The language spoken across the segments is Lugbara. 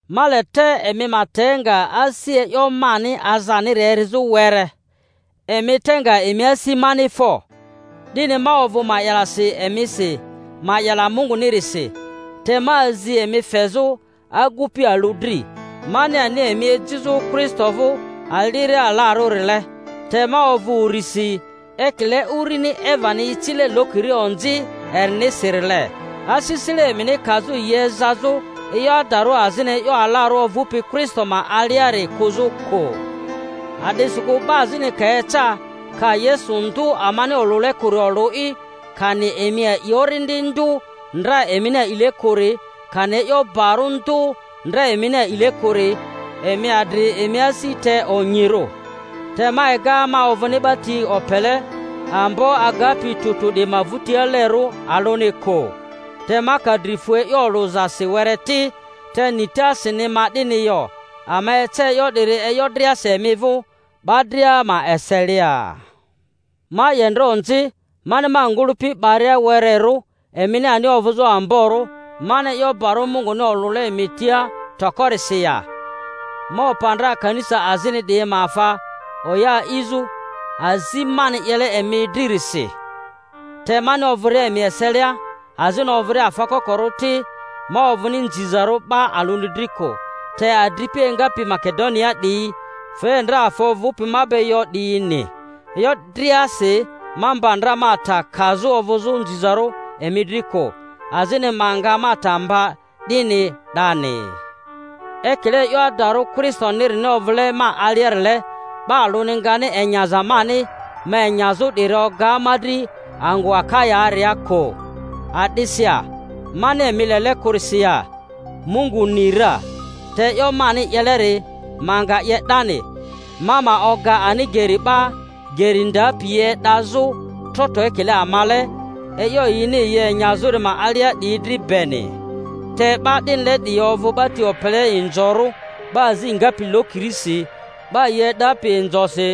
Ma le te emi ma te nga asi e'yo mani azaniri erizᴜ were. Emi te nga emi asi mani fo! 'Dini ma ovᴜ ma'yalasi emisi ma'yala Mungunirisi, te ma azi emi fezᴜ agupi alᴜ dri, mani ani emi ejizᴜ Kristo vᴜ aliria alarᴜrile. Te ma ovᴜ urisi, ekile urini Evani icile lokiri onzi erinisirile, asisile emini kazᴜ yi ezazᴜ e'yo adarᴜ azini e'yo alarᴜ ovᴜpi Kristo ma aliari kᴜzᴜ kᴜ. A'disikᴜ 'ba azini ka eca, ka Yesu ndᴜ amani olᴜle kᴜri olᴜ'i, kani emi a'i orindi ndᴜ ndra emini a'ile kᴜri, kani e'yo barᴜ ndᴜ ndra emini a'ile kᴜri, emi adri emi asi te onyirᴜ. Te ma ega ma ovᴜni 'ba ti opele ambo agapi tᴜ tᴜ 'diyi ma vᴜtialerᴜ alᴜni kᴜ. Te ma ka dri fu e'yo olᴜzasi were ti, te nitasini ma 'dini yo; ama ece e'yo 'diri e'yo driasi emi vᴜ, 'ba dria ma eselia. Ma 'ye ndra onzi mani ma ngᴜlᴜpi 'baria wererᴜ, emini ani ovᴜzᴜ amborᴜ, mani e'yo barᴜ Munguni olᴜle emi tia tokorisi ya? Ma opa ndra kanisa azini 'diyi ma afa, oya a'izᴜ, azi mani 'yele emi dririsi. Te mani ovᴜria emi eselia azini ovᴜria afa kokorᴜ ti, ma ovᴜni nzizarᴜ 'ba alᴜni dri kᴜ, te adripi engapi Makedoniaa 'diyi fe ndra afa ovᴜpi ma be yo 'diyini. E'yo driasi ma mba ndra ma ta ma kazᴜ ovᴜzᴜ nzizarᴜ emi dri kᴜ, azini ma nga ma ta mba 'dini 'dani. Ekile e'yo adarᴜ Kristonirini ovᴜle ma aliarile, 'ba alᴜni ngani enyaza mani ma enyazᴜ 'diri oga ma dri angᴜ Aka-yaaria kᴜ. A'disi ya? Mani emi lele kᴜrisi ya? Mungu ni ra! Te e'yo mani 'yeleri ma nga 'ye 'dani, ma ma oga ani geri 'ba geri ndapi yi e'dazᴜ trotro ekile amale, e'yo yini yi enyazᴜri ma alia 'diyi dri beni. Te 'ba 'dinile 'diyi ovᴜ 'ba ti opele inzorᴜ, 'ba azi ngapi lokirisi, 'ba yi e'dapi inzosi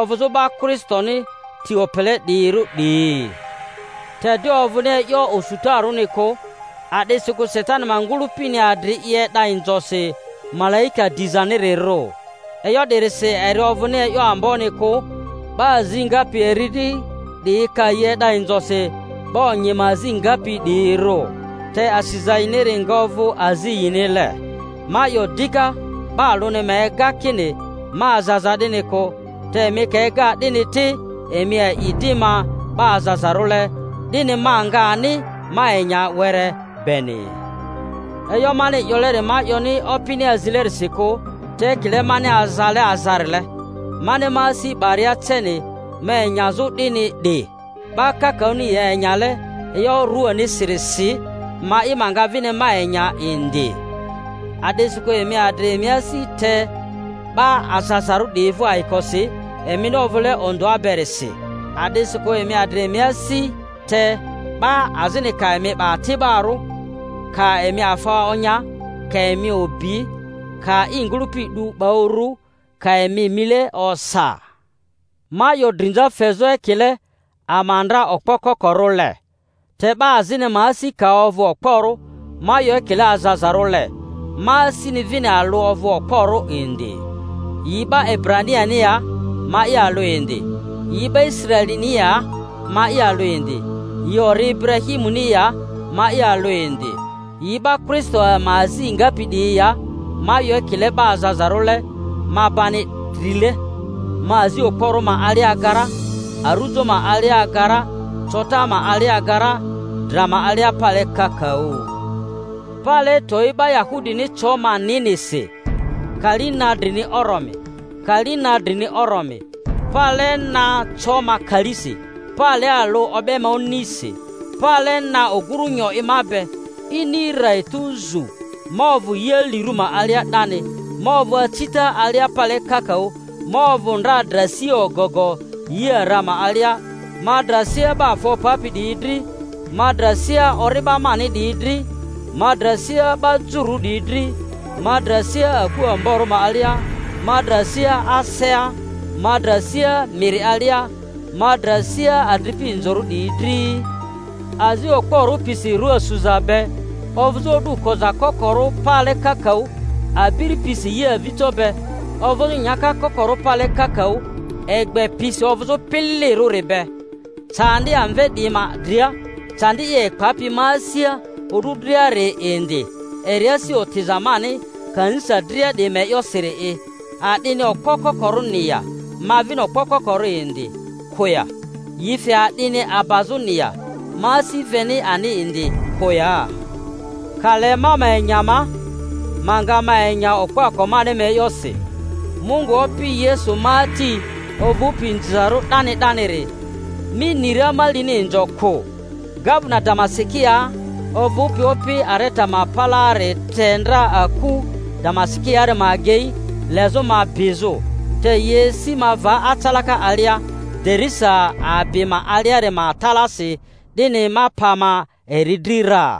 ovᴜzᴜ 'ba Kristoni ti opele 'diyirᴜ 'diyi. Te 'di ovᴜni e'yo osutarᴜni kᴜ, a'disikᴜ Satani ma ngᴜlᴜpini adri i e'da inzosi malaika dizanirirᴜ. E'yo 'dirisi eri ovᴜni e'yo amboni kᴜ 'ba azi ngapi eri dri 'diyi ka yi e'da inzosi 'ba onyi ma azi ngapi 'diyirᴜ. Te asiza yiniri nga ovᴜ azi yinile. Ma 'yo dika, 'Ba alᴜni ma ega kini ma azaza 'dini kᴜ; te emi ka ega 'dini ti, emi a'i di ma 'ba azazarᴜle, 'dini ma nga ani ma enya were beni. (E'yo mani 'yoleri ma 'yoni Opini azilerisi kᴜ, te ekile mani azale azarile, mani ma asi 'baria ceni ma enyazᴜ 'dini 'di; 'ba kakaᴜni yi enyale e'yo ruanisirisi, ma'i ma nga vini ma enya indi.) A'disikᴜ emi adri emi asi te 'ba azazarᴜ 'diyi vᴜ ayikosi, emini ovᴜle ondᴜa berisi! A'disikᴜ emi adri emi asi te 'ba azini ka emi 'ba ati'barᴜ, ka emi afa onya, ka emi obi, ka i ngᴜlᴜpi 'du 'ba uru, ka emi mile osa. Ma 'yo drinza fezᴜ, ekile ama ndra okpo kokorᴜle. Te 'ba azini ma asi ka ovᴜ okporᴜ —ma 'yo ekile azazarᴜle—ma asini vini alᴜ ovᴜ okporᴜ indi. Yi 'ba Ebraniani ya? Ma'i alᴜ indi. Yi 'ba Israelini ya? Ma'i alᴜ indi. Yi ori Iburahimuni ya? Ma'i alᴜ indi. Yi 'ba Kristo ma azi ngapi 'diyi ya? Ma 'yo ekile 'ba azazarᴜle—ma bani drile; ma azi okporᴜ ma alia aga ra, arujo ma alia aga ra, cota ma alia aga ra, dra ma alia pale kakaᴜ. Pale towi, 'ba Yahudini co ma ninisi kali na drini oromi, kali na drini oromi. Pale na co ma kalisi; pale alᴜ o'be ma onisi. Pale na ogmu nyo i ma be; ini rra, etu zu, ma ovᴜ yi alirᴜ ma alia 'dani; ma ovᴜ acita alia pale kakaᴜ, ma ovᴜ ndra dra sia ogogo yi ara ma alia, ma dra sia 'ba afa opapi 'diyi dri, ma dra sia ori'ba mani 'diyi dri, ma dra sia 'ba Jururᴜ 'diyi dri, ma dra sia aku amborᴜ ma alia, ma dra sia asea, ma dra sia miri alia, ma dra sia adripi inzorᴜ 'diyi dri; azi okporᴜ pisi rua suza be, ovᴜzᴜ o'du koza kokorᴜ pale kakaᴜ, abiri pisi yi avijo be, ovᴜzᴜ nyaka kokorᴜ pale kakaᴜ, egbe pisi ovᴜzᴜ pililirᴜri be. Candi amve 'diyi ma dria, candi i epapi ma asia o'du driari indi, eri asi otiza mani kanisa dria 'diyi ma e'yosiri'i. A'dini okpo kokorᴜni ya? Ma vini okpo kokorᴜ indi kᴜ ya? Yi fe a'dini abazᴜni ya? Ma asi veni ani indi kᴜ ya? Ka le ma ma enya ma, ma nga ma enya okpoako mani ma e'yosi. Mungu Opi Yesu ma Ati, ovᴜpi inzizarᴜ 'dani 'daniri, ni ra ma lini inzo kᴜ. Gavena Damasikiaa ovᴜpi opi Areta ma palaari te ndra aku Damasikiaari ma agei, lezᴜ ma bizᴜ, te yi esi ma va acalaka alia, derisa abi ma aliari ma talasi, 'dini ma pa ma eri dri ra.